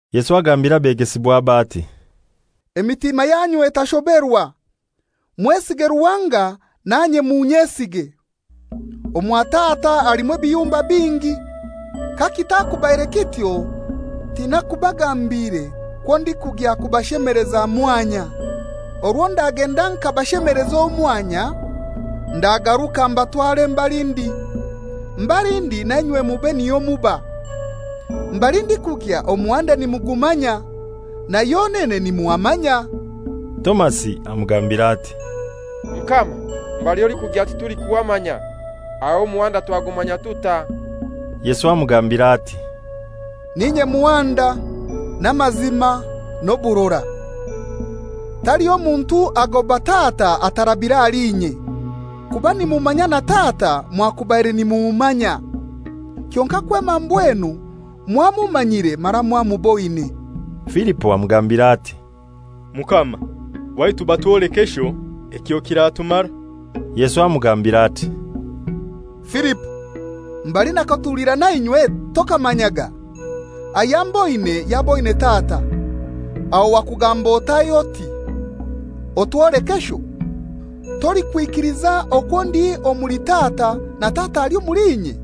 Yesu agambira abegesibwabe ati «Emitima yanyu etashoberwa. Mwesiga Ruhanga, nanye munyesige. Omwa Tata halimu ebiyumba bingi. Kakitakubaire kityo tinaikubagambiire kwo ndikugya kubashemeleza mwanya. Orwo ndagenda nkabashemeleza omwanya, ndagaruka mbatware mbali ndi. Mbali ndi nainywe mube niho muba. Mbali ndikugya omuhanda nimugumanya, na yonene nimuhamanya.» Tomasi amugambira ati, «Mukama, mbali olikugya titulikuhamanya; aho omuhanda twagumanya tutai?» Yesu amugambira ati, «N'inye muhanda, n'amazima, n'oburora. Taliho muntu agoba Tata atarabire ahali inye. Kuba nimumanya na Tata mwakubaire nimummanya. Kyonkai kwema mbwenu mwamumanyire mara mwamuboine.» Filipo amugambira ati, «Mukama, waitu batwoleke Sho, ekyo kiratumara.» Yesu amugambira ati, «Filipo, mbali nakatulira nainywe tokamanyaga? Ayamboine yaboine Tata. Aho wakugamba otai oti, ‹Otwoleke Sho?› Tolikwikiliza okwo ndi omuli Tata na Tata ali omuli inye?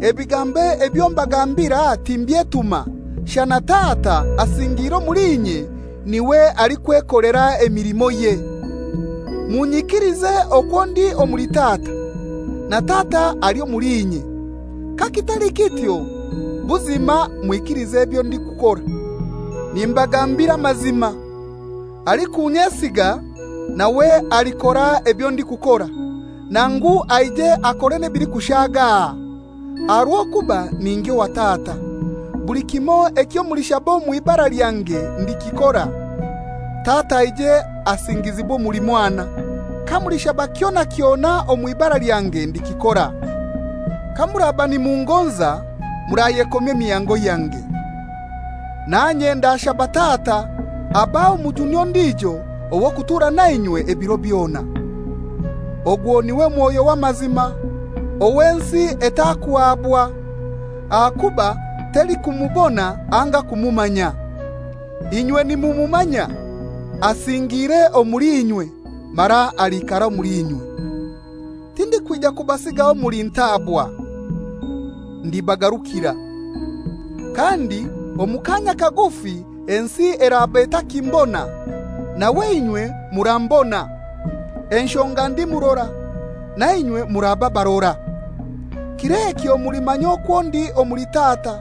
Ebigambo ebyo mbagambira timbyetuma; shana Tata asingiire omuli inye n'iwe alikwekolera emilimoye. Munyikilize okwo ndi omuli Tata, na Tata ali omuli inye; kakitali kityo, buzima mwikilize ebyo ndikukora. «Nimbagambira amazima, alikunyesiga, nawe alikora ebyo ndikukora; nangu aije akore ebilikushaga aha, aha rw'okuba ningya owa Tata. Buli kimoi ekyo mulishaba omw'ibara lyange ndikikora, Tata aije asingizibwe omuli Mwana. Kamulishaba kyona kyona omw'ibara lyange ndikikora. «Kamuraba nimungonza, murayekomya emihango yange. Nanye ndashaba Tata abahe Omujuni ondijo ow'okutuura nainywe ebiro byona. Ogwo n'iwe Mwoyo w'amazima, ow'ensi etakuhabwa, ahakuba telikumubona anga kumumanya. Inywe nimumumanya, asingiire omuli inywe, mara aliikara omuli inywe. «Tindikwija kubasigaho muli ntaabwa; ndibagarukira. Kandi omu kaanya kagufi ensi eraba etakimbona, nawe inywe murambona; enshonga ndi murora, nainywe muraba barora. Kir'ekyo mulimanya okwo ndi omuli Tata,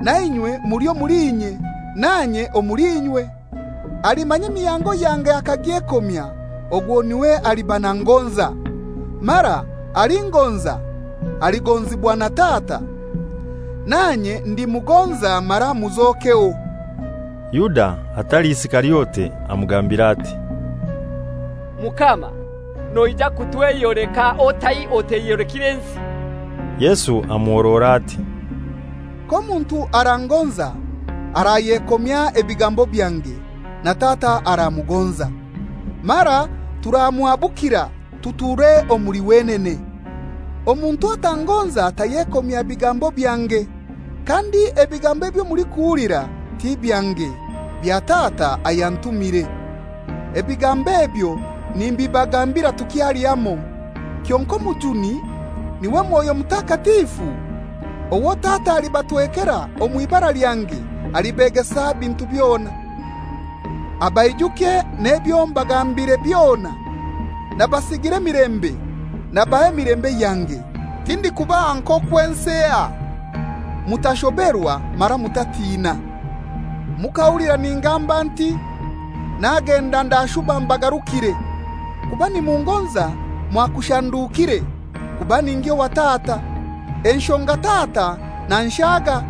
nainywe omuli inye nanye omuli inywe. Alimanya emihango yange akagyekomya, ogwo n'iwe aliba nangonza. Mara alingoza, aligonzibwa na Tata, nanye ndimugonza mara muzokeho.» Yuda (atali Isikariote) amugambira ati, «Mukama, noija kutweyoleka otai oteyolekire nsi?» Yesu amuhorora ati, «K'omuntu arangonza, arayekomya ebigambo byange, na Tata aramugonza, mara turamuhabukira tuture omuli wenene. Omuntu atangonza tayekomya bigambo byange. Kandi ebigambo ebyo mulikuhulira ti byange, bya Tata ayantumire. «Ebigambo ebyo nimbibagambira tukyali hamoi. Kyonkai Omujuni, n'iwe Mwoyo Mutakatifu, owo Tata alibatwekera omw'ibara lyange, alibegesa ebintu byona, abaijukye n'ebyo mbagambiire byona. Nabasigira emilembe; nabaha emilembe yange; tindikubaha nk'okwo ensi eha. Mutashoberwa mara mutatina. Mukahulira ningamba nti, ‹Nagenda, ndashuba mbagarukire.› Kuba nimungonza mwakushandukire, kuba ningya owa tata; enshonga Tata nanshaga.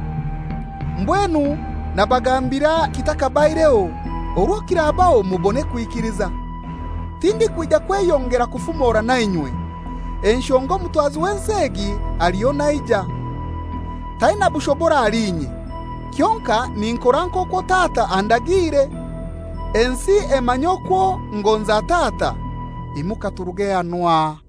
Mbwenu nabagambira kithakabaireho, orwo kirabaho mubone kwikiliza. Tindikwija kweyongera kufumora nainywe, enshonga omutwazi w'ensi egi aliho naija. Taina bushobora ahali inye; kyonkai ninkora nk'okwo Tata andagiire, ensi emanye okwo ngonza Tata. Imuka turuge hanu aha.